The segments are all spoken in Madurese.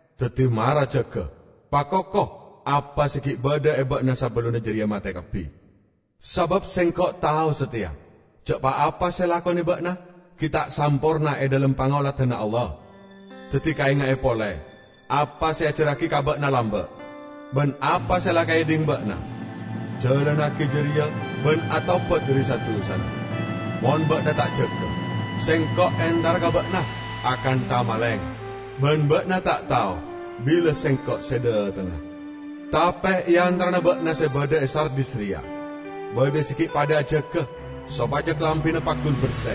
Daddi mara jaga, pakoko apa se gi' badha e ba'na sabellunna jareya mate kabbi. Sabab Sengko' tao sateya ja' pa-apa se elakone ba'na gi' ta' samporna e dhalem pangoladanna Allah. Daddi kaenga'e pole apa se eajarragi ka ba'na lamba' ban apa se la ekaedhing ba'na. Jalannagi jareya ban atobat dhari sa-dusana. Mon ba'na ta' jaga, Sengko' entara ka ba'na akantha maleng; ban ba'na ta' tao bila Sengko' se dhatengnga. Tape e antarana ba'na se badha e Sardis reya badha se gi' padha ajaga sopaja kalambina paggun berse.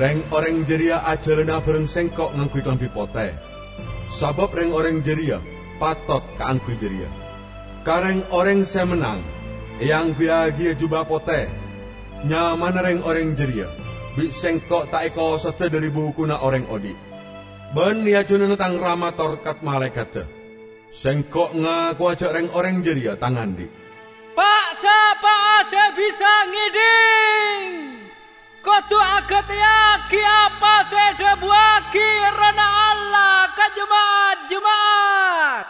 Reng-oreng jareya ajalana abareng Sengko' ngangguy kalambi pote, sabab reng-oreng jareya patot kaangguy jareya. Ka reng-oreng se mennang eangguyyagiya juba pote. Nyamana reng-oreng jareya bi' Sengko' ta' ekosoda dhari Bukuna Oreng Odhi'. Ban e ajunanna Tang Rama tor kat-malaekadda Sengko' ngakowa ja' reng-oreng jareya Tang andhi'. Pa'-sapa'a se bisa ngedhing, kodu agateyagi apa se edhabuwagi Errohna Allah ka jema'at-jema'at!"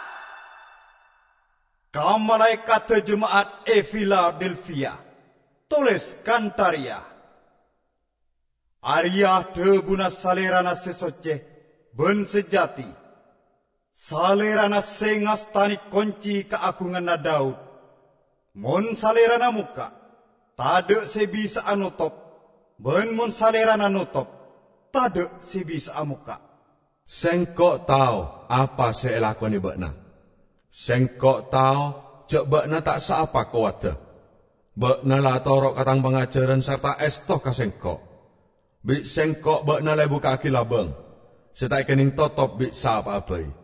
"Ka malaekadda jema'at e Filadelfia, toles kantha reya: Areya' dhabuna Salerana se socce ban sajati. Salerana se ngastane konci kaagunganna Daud; mon Salerana mokka', tadha' se bisa'a notop; ban mon Salerana notop, tadha' se bisa'a mokka'. Sengko' tao apa se elakone ba'na. Sengko' tao ja' ba'na ta' saapa kowadda. Ba'na la atoro' ka Tang pangajaran sarta esto ka Sengko'. Bi' Sengko' ba'na la ebukka'agi labang, se ta' ekenneng totop bi' sapa'a bai.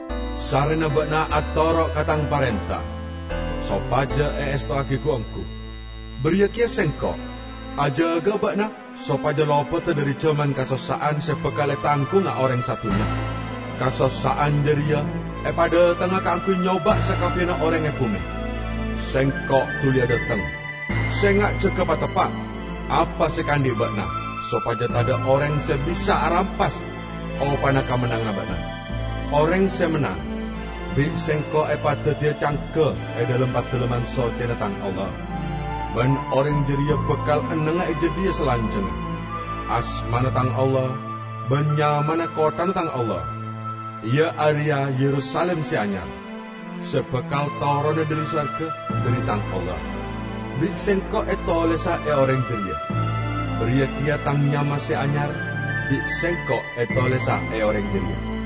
Sarrena ba'na atoro' ka Tang parenta sopaja eestowagi gu-onggu, bariya keya Sengko' ajaga'a ba'na sopaja lopoda dhari jaman kasossa'an se bakal etanggunga oreng sadunnya; kasossa'an jareya epadhatengnga kaangguy nyoba' sakabbiyanna oreng e bume. Sengko' duliya dhateng! Senga' jaga pateppa' apa se ekaandhi' ba'na, sopaja tadha' oreng se bisa arampas opana kamennanganna ba'na. Oreng se mennang bi' Sengko' epadaddiya cangga e dhalem padalemman soccena Tang Allah, ban oreng jareya bakal ennengnga e jadhiya salanjangnga. Asmana Tang Allah, ban nyamana kotthana Tang Allah -- iya areya Yerusalim se anyar se bakal torona dhari sowarga, dhari Tang Allah -- bi' Sengko' etolesa e oreng jareya. Bariya keya Tang nyama se anyar bi' Sengko' etolesa e oreng jareya.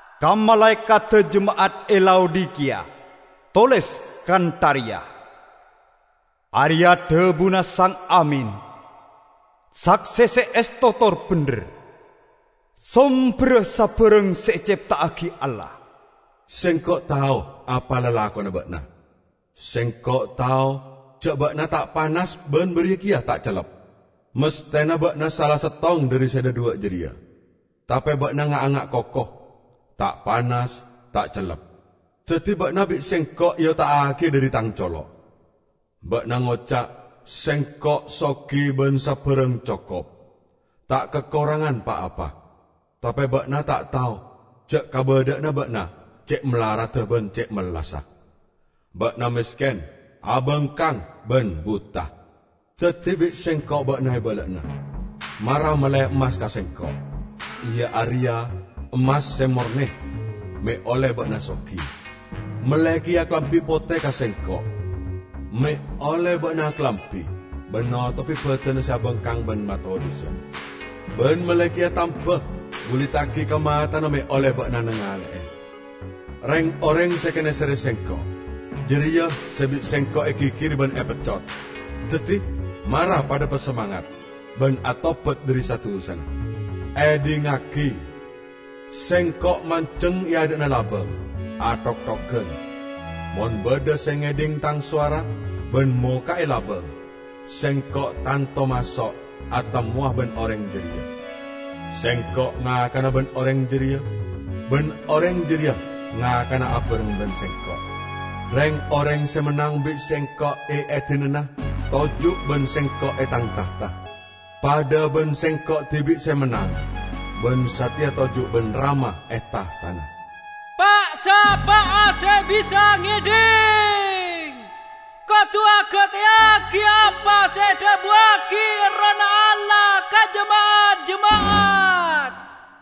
"Ka malaekadda jema'at e Laodikiya toles kantha reya: Areya' dhabuna Sang Amin, sakse se esto tor bendher, somberra sabarang se ecepta'agi Allah. Sengko' tao apa lalakonna ba'na. Sengko' tao ja' ba'na ta' panas ban bariya keya ta' cellep. Masthena ba'na sala settong dhari se dhadhuwa' jareya! Tape ba'na nga'-anga' koko; ta' panas, ta' cellep. Daddi ba'na bi' Sengko' eota'agiya dhari Tang colo'. Ba'na ngoca', 'Sengko' sogi ban sabarang cokop, ta' kakorangan pa-apa.' Tape ba'na ta' tao ja' kabadha'anna ba'na ce' malaradda ban ce' mellassa! Ba'na mesken, abangkang, ban buta. Daddi bi' Sengko' ba'na ebala'ana, mara melle emmas ka Sengko', iya areya emmas se morne, me' olle ba'na sogi. Melle keya kalambi pote ka Sengko', me' olle ba'na akalambi ban notobi badanna se abangkang ban matodhusan. Ban melle keya tamba buliddagi ka matana me' olle ba'na nangale'e. Reng-oreng se ekaneserre Sengko', jareya se bi' Sengko' egigiri ban epeccot. Daddi mara padha pasamangat, ban atobat dhari sa-dusana. Edhingngagi! Sengko' manjeng e adha'na labang, athokthogan. Mon badha se ngedhing Tang sowara, ban mokka'e labang, Sengko' tanto maso' atemmowa ban oreng jareya; Sengko' ngakana ban oreng jareya, ban oreng jareya ngakana abareng ban Sengko'. Reng-oreng se mennang bi' Sengko' eedinana toju' ban Sengko' e Tang tahta, padha ban Sengko' dibi' se mennang ban sateya toju' ban Rama e tahtana. Pa'-sapa'a se bisa ngedhing, kodu agateyagi apa se edhabuwagi Errohna Allah ka jema'at-jema'at!"